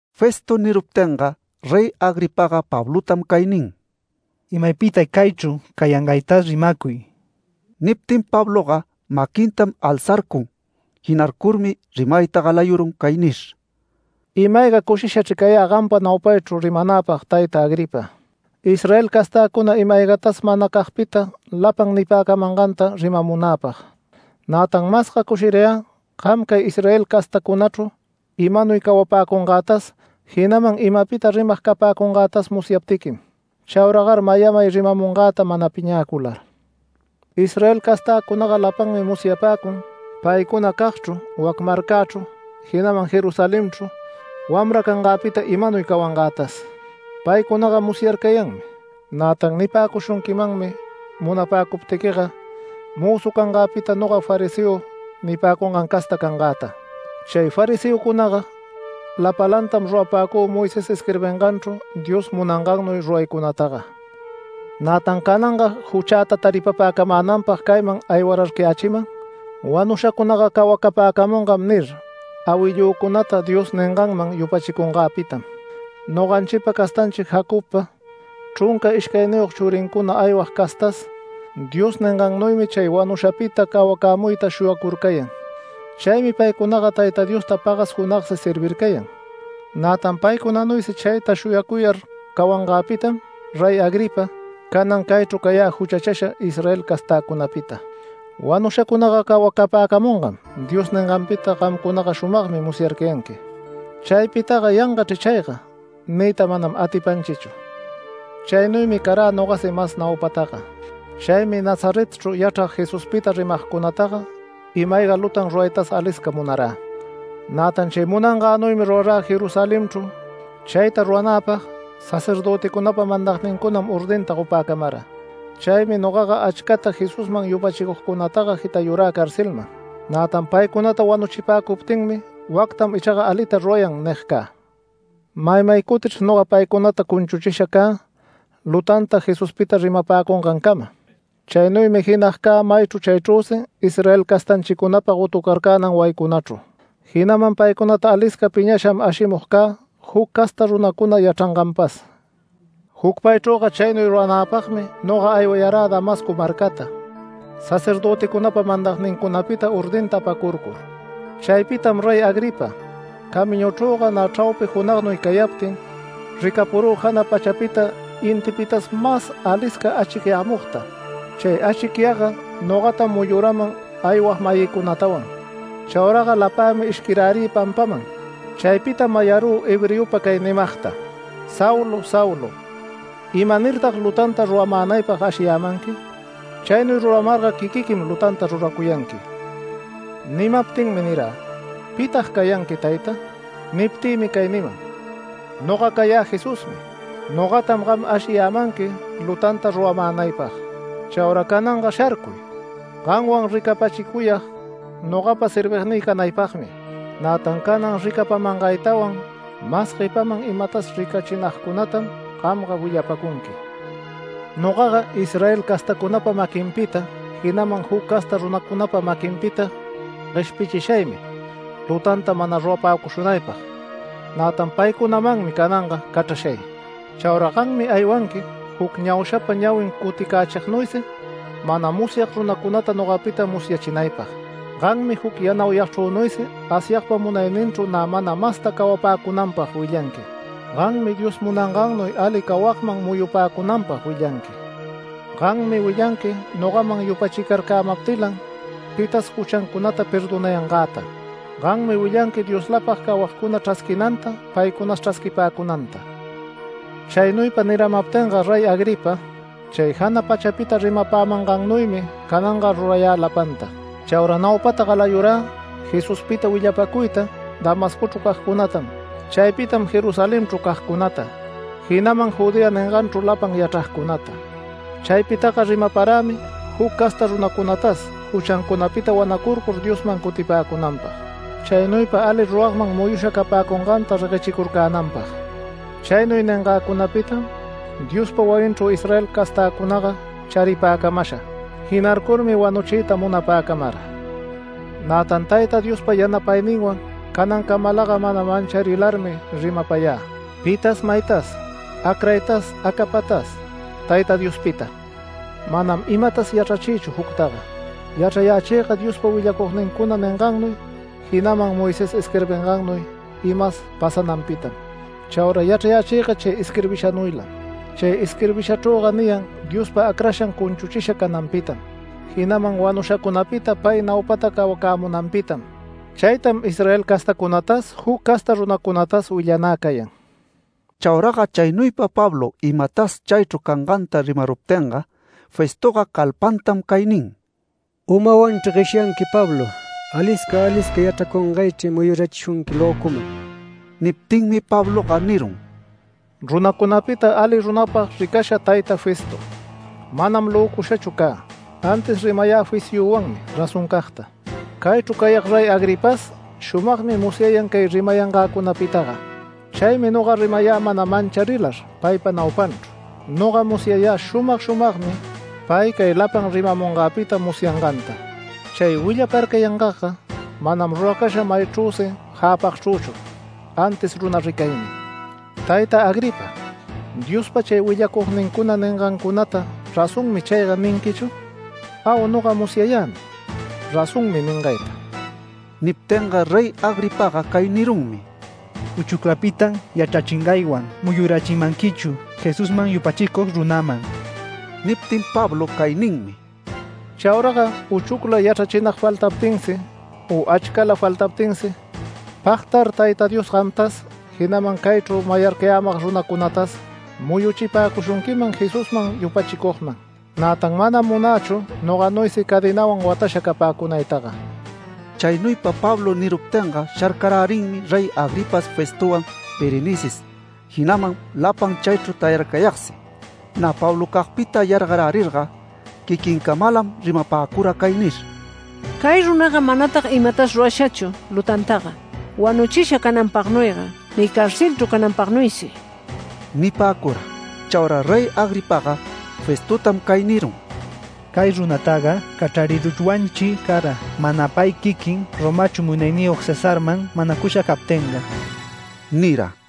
Festo niruptinga Rey Agripaga Pablotam cay nin: “Imapita caychru cayangaytas rimacuy”. Niptin Pabloga maquintam alzarcun. Jinarcurmi rimayta galayurun cay nir: “Ima-ayga cushishachr cayä gampa naupaychru rimanäpag tayta Agripa, Israel castäcuna ima-aygatas manacagpita lapan nipäcamanganta rimamunäpag. Nätan masga cushirayä gam cay Israel castäcunachru imanuy cawapäcungätas, jinaman imapita rimag capäcungätas musyaptiquim. Chauragar mayamay rimamungäta mana piñäcular. Israel castäcunaga lapanmi musyapäcun paycunacagchru, wac marcächru, jinaman Jerusalenchru wamra canganpita imanuy cawangätas. Paycunaga musyarcayanmi, nätan nipäcushunquimanmi munapäcuptiquiga mözu cangäpita noga fariseo nipäcungan casta cangäta. Chay fariseocunaga lapalantam rurapäcü Moisés isquirbinganchru Dios munangannuy ruraycunataga. Nätan cananga juchäta taripapäcamänanpag cayman aywararcayächiman ‘Wanushacunaga cawacapäcamungam’ nir, awillücunata Dios ninganman yupachicunganpitam. Noganchipa castanchi Jacobpa chrunca ishcayniyog churincuna aywag castas Dios ningannuymi chay wanushapita cawacämuyta shuyacurcayan. Chaymi paycunaga Tayta Diosta pagas junagsi servircayan, nätan paycunanuysi chayta shuyacuyar cawangäpitam Rey Agripa, canan caychru cayä juchachasha Israel castäcunapita. ‘Wanushacunaga cawacapäcamungam’ Dios ninganpita gamcunaga shumagmi musyarcayanqui. Chaypitaga ‘Yangachr chayga’ niyta manam atipanchichu. Chaynuymi carä nogasi mas naupataga. Chaymi Nazaretchru yachrag Jesuspita rimagcunataga, ima-ayga lutan ruraytas alisca munarä. Nätan chay munangänuymi rurarä Jerusalenchru. Chayta ruranäpag sacerdöticunapa mandagnincunam ordinta gopäcamara. Chaymi nogaga achcata Jesusman yupachicugcunataga jitayurä carcelman. Nätan paycunata wanuchipäcuptinmi ‘Wactam ichaga alita rurayan’ nig cä. Maymay cutichr noga paycunata cunchuchisha cä lutanta Jesuspita rimapäcungancama. Chaynuymi jinag cä maychru chaychrüsi Israel castanchicunapa gotucarcänan wayincunachru. Jinaman paycunata alisca piñasham ashimug cä juc casta runacuna yachranganpas. Jucpaychrüga chaynuy ruranäpagmi noga aywayarä Damasco marcata, sacerdöticunapa mandagnincunapita ordinta apacurcur. Chaypitam Rey Agripa, camiñuchrüga nä chraupi junagnuy cayaptin, ricapurü jana pachapita, intipitas mas alisca achicyämugta. Chay achicyagga nogatam muyuraman aywag-mayïcunatawan. Chauraga lapämi ishquirärï pampaman. Chaypitam mayarü hebreopa cay nimagta: ‘Saulo, Saulo, ¿imanirtag lutanta ruramänaypag ashiyämanqui? Chaynuy ruramarga quiquiquim lutanta ruracuyanqui’. Nimaptinmi nirä: ‘¿Pitag cayanqui tayta?’ Niptïmi cay niman: ‘Noga cayä Jesusmi. Nogatam gam ashiyämanqui lutanta ruramänaypag. Chaura cananga sharcuy. Gamwan ricapachicuyag nogapa servignï canaypagmi, nätan canan ricapamangaytawan mas guepaman imatas ricachinagcunatam gamga willapacunqui. Nogaga Israel castacunapa maquinpita, jinaman juc casta runacunapa maquinpita gueshpichishaymi lutanta mana rurapäcushunaypag. Nätan paycunamanmi cananga cachrashay. Chaura gammi aywanqui juc ñaushapa ñawin cuticächignuysi mana musyag runacunata nogapita musyachinaypag. Gammi juc yanauyagchrünuysi Asyagpa munayninchru nä mana masta cawapäcunanpag willanqui. Gammi Dios munangannuy ali cawagman muyupäcunanpag willanqui. Gammi willanqui nogaman yupachicarcämaptilan pitas juchancunata perdonayangäta. Gammi willanqui Dioslapag cawagcuna chrasquinanta paycunas chrasquipäcunanta’. Chaynuypa niramaptinga Rey Agripa, chay jana pachapita rimapämangannuymi cananga rurayä lapanta. Chaura naupata galayurä Jesuspita willapäcuyta Damascochru cagcunatam. Chaypitam Jerusalenchru cagcunata, jinaman Judea ninganchru lapan yachragcunata. Chaypitaga rimaparämi juc casta runacunatas juchancunapita wanacurcur Diosman cutipäcunanpag, chaynuypa ali ruragman muyusha capäcunganta reguechicurcänanpag. Chaynuy ningäcunapitam Diospa wayinchru Israel castäcunaga charipäcamasha. Jinarcurmi wanuchiyta munapäcamara. Nätan Tayta Diospa yanapayninwan canancamalaga mana mancharilarmi rimapayä pitas maytas acraytas acapatas Tayta Diospita. Manam imatas yachrachïchu juctaga. Yachrayächïga Diospa willacugnincuna ningannuy, jinaman Moisés isquirbingannuy imas pasananpitam. Chaura yachrayächïga chay isquirbishanuylam. Chay isquirbishachrüga niyan Diospa Acrashan cunchuchisha cananpitam, jinaman wanushacunapita pay naupata cawacämunanpitam. Chaytam Israel castacunatas juc casta runacunatas willanä cayan”. Chauraga chaynuypa Pablo imapitas chaychru canganta rimaruptinga, Festoga calpantam cay nin: “¡Umawanchri gueshyanqui, Pablo! ¡Alisca alisca yachracungaychri muyurachishunqui löculan!” Niptinmi Pabloga nirun: “Runacunapita ali runapag ricasha tayta Festo, manam löcushachu cä, antis rimayä fisyüwanmi razoncagta. Caychru cayag Rey Agripas, shumagmi musyayan cay rimayangäcunapitaga. Chaymi noga rimayä mana mancharilar paypa naupanchru. Noga musyayä shumag shumagmi pay cay lapan rimamungäpita musyanganta. Chay willaparcayangagga manam ruracasha mayagchrüsi jäpagchrüchu, antis runa ricaymi. Tayta Agripa, ¿Diospa chay willacugnincuna ningancunata ‘Razonmi chayga’ ninquichu? Au, noga musyayämi ‘Razonmi’ ningayta”. Niptinga Rey Agripaga cay nirunmi: “¡Uchuclapitam yachrachingaywan muyurachimanquichu Jesusman yupachicug runaman!” Niptin Pablo cay ninmi: “Chauraga uchucla yachrachinag faltaptinsi u achcala faltaptinsi pagtar Tayta Dios gamtas, jinaman caychru mayarcayämag runacunatas muyuchipäcushunquiman Jesusman yupachicugman. Nätan manam munächu noganuysi cadenawan watasha capäcunaytaga”. Chaynuypa Pablo niruptinga sharcarärinmi Rey Agripas Festowan Berenices, jinaman lapan chaychru tayarcayagsi. Nä Pablocagpita yargarärirga quiquincamalam rimapäcura cay nir: “Cay runaga manatag imatas rurashachu lutantaga wanuchisha cananpagnuyga ni carcelchru cananpagnuysi” nipäcura. Chaura Rey Agripaga Festotam cay nirun: “Cay runataga cachrariruchwanchri cara mana pay quiquin Romachru Munayniyog Cesarman manacusha captinga” nira.